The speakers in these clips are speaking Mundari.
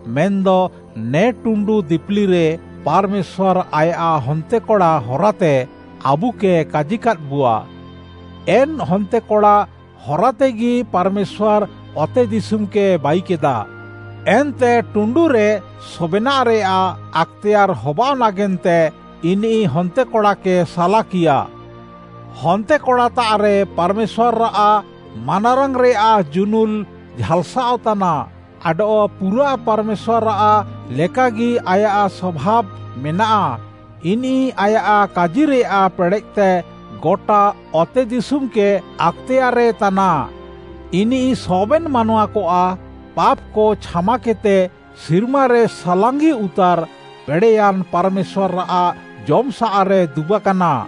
ମେନ୍‌ଦ ନେ ଟୁଣ୍ଡୁ ଦିପିଲିରେ ପାର୍‌ମେଶ୍ୱାର୍‌ ଆୟାଃ ହନ୍ତେକଡ଼ା ହରାତେ ଆବୁକେ କାଜିକାଦ୍‌ବୁଆ। ଏନ୍‌ ହନ୍ତେକଡ଼ା ହରାତେଗି ପାର୍‌ମେଶ୍ୱାର୍‌ ଅତେଦିଶୁମ୍‌କେ ବାଇକେଦା, ଏନ୍ତେ ଟୁଣ୍ଡୁରେ ସବେନାଃରେୟାଃ ଆକ୍‌ତେୟାର୍‌ ହବାଅଃ ନାଗେନ୍ତେ ଇନିଃ ହନ୍ତେକଡ଼ାକେ ସାଲାକିୟା। ହନ୍ତେକଡ଼ାତାଃରେ ପାର୍‌ମେଶ୍ୱାର୍‌ଆଃ ମାନାରାଙ୍ଗ୍‌ରେୟାଃ ଜୁନୁଲ୍‌ ଝାଲ୍‌ସାଃଅ ତାନା ଆଡଃ ପୁରା ପାର୍‌ମେଶ୍ୱାର୍‌ଆଃ ଲେକାଗି ଆୟାଃ ସଭାବ୍‌ ମେନାଃ। ଇନିଃ ଆୟାଃ କାଜିରେୟାଃ ପେଡ଼େଃତେ ଗଟା ଅତେଦିଶୁମ୍‌କେ ଆକ୍‌ତେୟାର୍‌ରେ ତାନା। ଇନିଃ ସବେନ୍‌ ମାନୱାକଆଃ ପାପ୍‌କ ଛାମାକେଦ୍‌ତେ, ସିର୍ମାରେ ସାଲାଙ୍ଗିଉତାର୍‌ ପେଡ଼େୟାନ୍‌ ପାର୍‌ମେଶ୍ୱାର୍‌ଆଃ ଜମ୍‌ସାଃରେ ଦୁବାକାନା।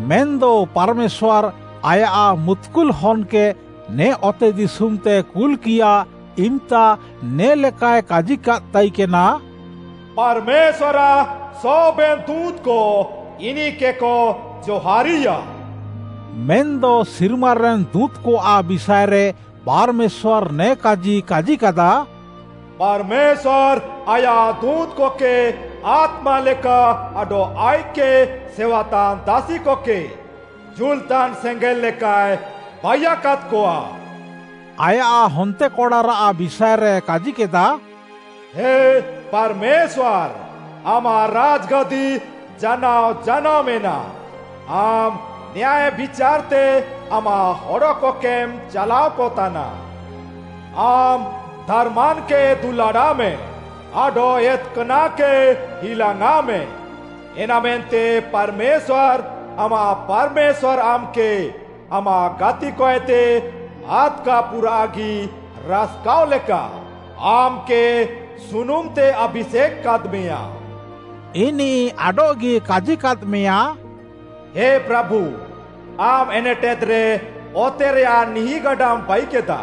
ମେନ୍‌ଦ ପାର୍‌ମେଶ୍ୱାର୍‌ ଆୟାଃ ମୁତ୍‌କୁଲ୍‌ ହନ୍‌କେ ନେ ଅତେଦିଶୁମ୍‌ତେ କୁଲ୍‌କିୟା ଇମ୍‌ତା ନେ'ଲେକାଏ କାଜିକାଦ୍‌ ତାଇକେନା, “ପାର୍‌ମେଶ୍ୱାର୍‌ଆଃ ସବେନ୍‌ ଦୁଁତ୍‌କ ଇନିଃକେକ ଜହାର୍‌ରିୟା।” ମେନ୍‌ଦ ସିର୍ମାରେନ୍‌ ଦୁଁତ୍‌କଆଃ ବିଷାଏରେ ପାର୍‌ମେଶ୍ୱାର୍‌ ନେ କାଜି କାଜିକାଦା; “ପାର୍‌ମେଶ୍ୱାର୍‌ ଆୟାଃ ଦୁଁତ୍‌କକେ ଆତ୍ମା ଲେକା ଆଡଃ ଆଇଃକ୍‌କେ ସେୱାତାନ୍‌ ଦାସିକକେ ଜୁଲ୍‌ତାନ୍‌ ସେଙ୍ଗେଲ୍‌ ଲେକାଏ ବାଇୟାକାଦ୍‌କଆ।” ଆୟାଃ ହନ୍ତେକଡ଼ାରାଃ ବିଷାଏରେ କାଜିକେଦା, “ହେ ପାର୍‌ମେଶ୍ୱାର୍‌, ଆମାଃ ରାଜ୍‌ଗାଦି ଜାନାଅ ଜାନାଅ ମେନାଃ! ଆମ୍‌ ନ୍ୟାୟ ବିଚାର୍‌ତେ ଆମାଃ ହଡ଼କକେମ୍‌ ଚାଲାଅକ ତାନା। ଆମ୍‌ ଧାର୍‌ମାନ୍‌କେ ଦୁଲାଡ଼ାଃମେ ଆଡଃ ଏତ୍‌କାନାଃକେ ହିଲାଙ୍ଗ୍‌ଆଁଃମେ। ଏନାମେନ୍ତେ ପାର୍‌ମେଶ୍ୱାର୍‌, ଆମାଃ ପାର୍‌ମେଶ୍ୱାର୍‌ ଆମ୍‌କେ ଆମାଃ ଗାତିକଏତେ ଆଦ୍‌କା ପୁରାଃଗି ରାସ୍‌କାଅଃ ଲେକା, ଆମ୍‌କେ ସୁନୁମ୍‌ତେ ଆଭିଷେକ୍‌ କାଦ୍‌ମେୟାଁ।” ଇନିଃ ଆଡଃଗି କାଜିକାଦ୍‌ମେୟା, “ହେ ପ୍ରାଭୁ, ଆମ୍‌ ଏନେଟେଦ୍‌ରେ ଅତେରେୟାଃ ନିହିଁଗାଡାମ୍‌ ବାଇକେଦା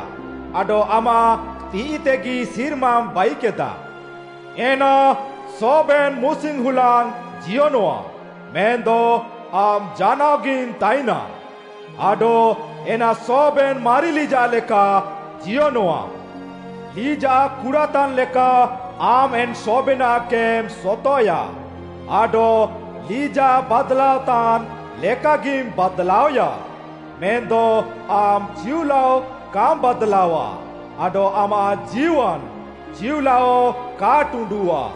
ଆଡଃ ଆମାଃ ତିଃଇତେଗି ସିର୍ମାମ୍‌ ବାଇକେଦା। ଏନା ସବେନାଃ ମୁସିଙ୍ଗ୍‌ ହୁଲାଙ୍ଗ୍‌ ଜିୟନଃଆ। ମେନ୍‌ଦ ଆମ୍‌ ଜାନାଅଗିମ୍‌ ତାଇନା, ଆଡଃ ଏନା ସବେନ୍‌ ମାରି ଲିଜାଃ ଲେକା ଜିୟନଃଆ। ଲିଜାଃ କୁଡ଼ାତାନ୍‌ ଲେକା ଆମ୍‌ ଏନ୍‌ ସବେନାଃକେମ୍‌ ସତଃଏୟା ଆଡଃ ଲିଜାଃ ବାଦ୍‌ଲାଅତାନ୍‌ ଲେକାଗିମ୍‌ ବାଦ୍‌ଲାଅଏୟା। ମେନ୍‌ଦ ଆମ୍‌ ଚିଉଲାଅ କାମ୍‌ ବାଦ୍‌ଲାଅଃଆ ଆଡଃ ଆମାଃ ଜୀୱାନ୍‌ ଚିଉଲାଅ କା ଟୁଣ୍ଡୁଃଆ।”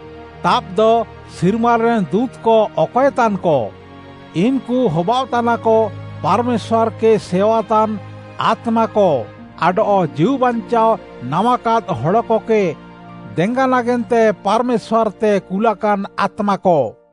ତାବ୍‌ଦ, ସିର୍ମାରେନ୍‌ ଦୁଁତ୍‌କ ଅକଏତାନ୍‌କ? ଇନ୍‌କୁ ହବାଅଃତାନାକ ପାର୍‌ମେଶ୍ୱାର୍‌କେ ସେୱାତାନ୍‌ ଆତ୍ମାକ ଆଡଃ ଜୀଉବାଞ୍ଚାଅ ନାମାକାଦ୍‌ ହଡ଼କକେ ଦେଙ୍ଗା ନାଗେନ୍ତେ ପାର୍‌ମେଶ୍ୱାର୍‌ତେ କୁଲାକାନ୍‌ ଆତ୍ମାକ।